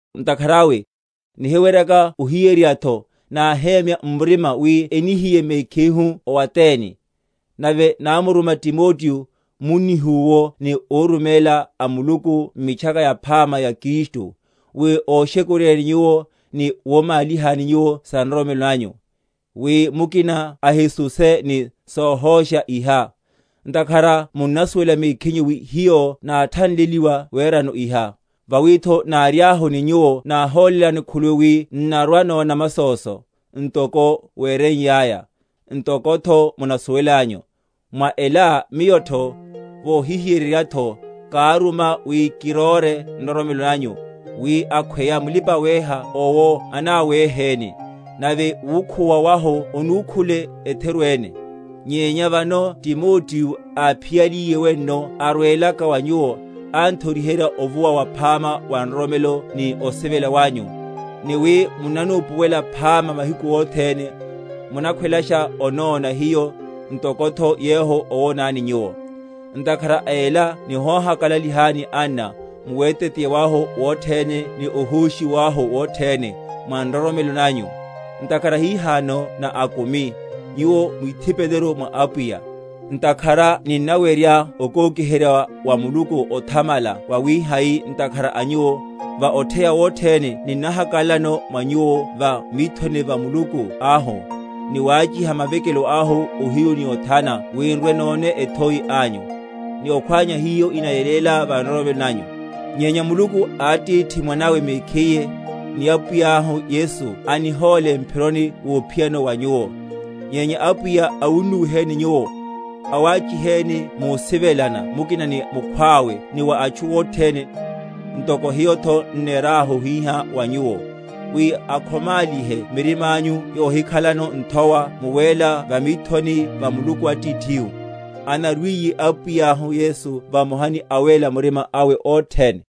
Ntakhara awe, nihiweryaka ohiyeryeryatho, náhemya m’murima wi enihiye mekhihu o Atene; nave námuruma Timoteo, munnihu’wo ni óruméla a Muluku m’Mitchaka Yaphama ya Kristu, wi oshekuryeni nyuwo, ni womálihani nyuwo sa nroromelo nanyu; wi mukina ahisuseye ni sohósha iha, ntakhara munnasuwela mekhinyu wi hiyo náthanleliwa werano iha. Vawitho, náriahu ni nyuwo náholélani khuluwi wi n’narwa‐nona masóso; ntoko wereiyaya, ntokotho munasuwelanyu. Mwa ela miyotho, vohihiyeryeryatho, káruma wi kiróre nroromelo nanyu, wi akhweya mulipa‐weha owo anaweheni, nave wukhuwa wahu onúkhule etheru ene. Nyenya vano Timoteo áphiyaliye wenno arwelaka wa nyuwo, anthoriherya ovuwa waphama wa nroromelo ni osivela wanyu, ni wi munnanupuwela phama mahiku othene, munakhwelasha onóna hiyo, ntokotho yehu owonani nyuwo; Ntakhara a ela nihohakalalelani, anna, mu weteteya wahu wothene ni ohóshiwa wahu wothene, mwa nroromelo nanyu; ntakhara hihano na akumi, nyuwo mwithipeleru mwa Apwiya. Ntakhara ninnawerya okokiherya wa Muluku othamala wawihai ntakhara a nyuwo, va otheya wothene ninnahakalalano mwa nyuwo va mithoni va Muluku ahu; ni wáchiha mavekelo ahu ohiyu ni othana wi n’rwe‐none ethoi anyu, ni okhwánya hiho inayeléla va nroromelo nanyu? Nyenya Muluku Atithihu mwanene mekhiye, ni Apwiyahu Yesu anihóle mphiro wophiyano wa nyuwo; nyenya Apwiya awunnuwiheni nyuwo, awáchiheni musivelana mukina ni mukhwawe ni wa atchu othene, ntoko hiyotho n’nerahu hihá wa nyuwo; wi akhomálihe mirimányu yohikhalano nthowa mu wéla va mithoni va Muluku Atithihu, anarwiye Apwiyahu Yesu vamoha ni awéla murima awe othene.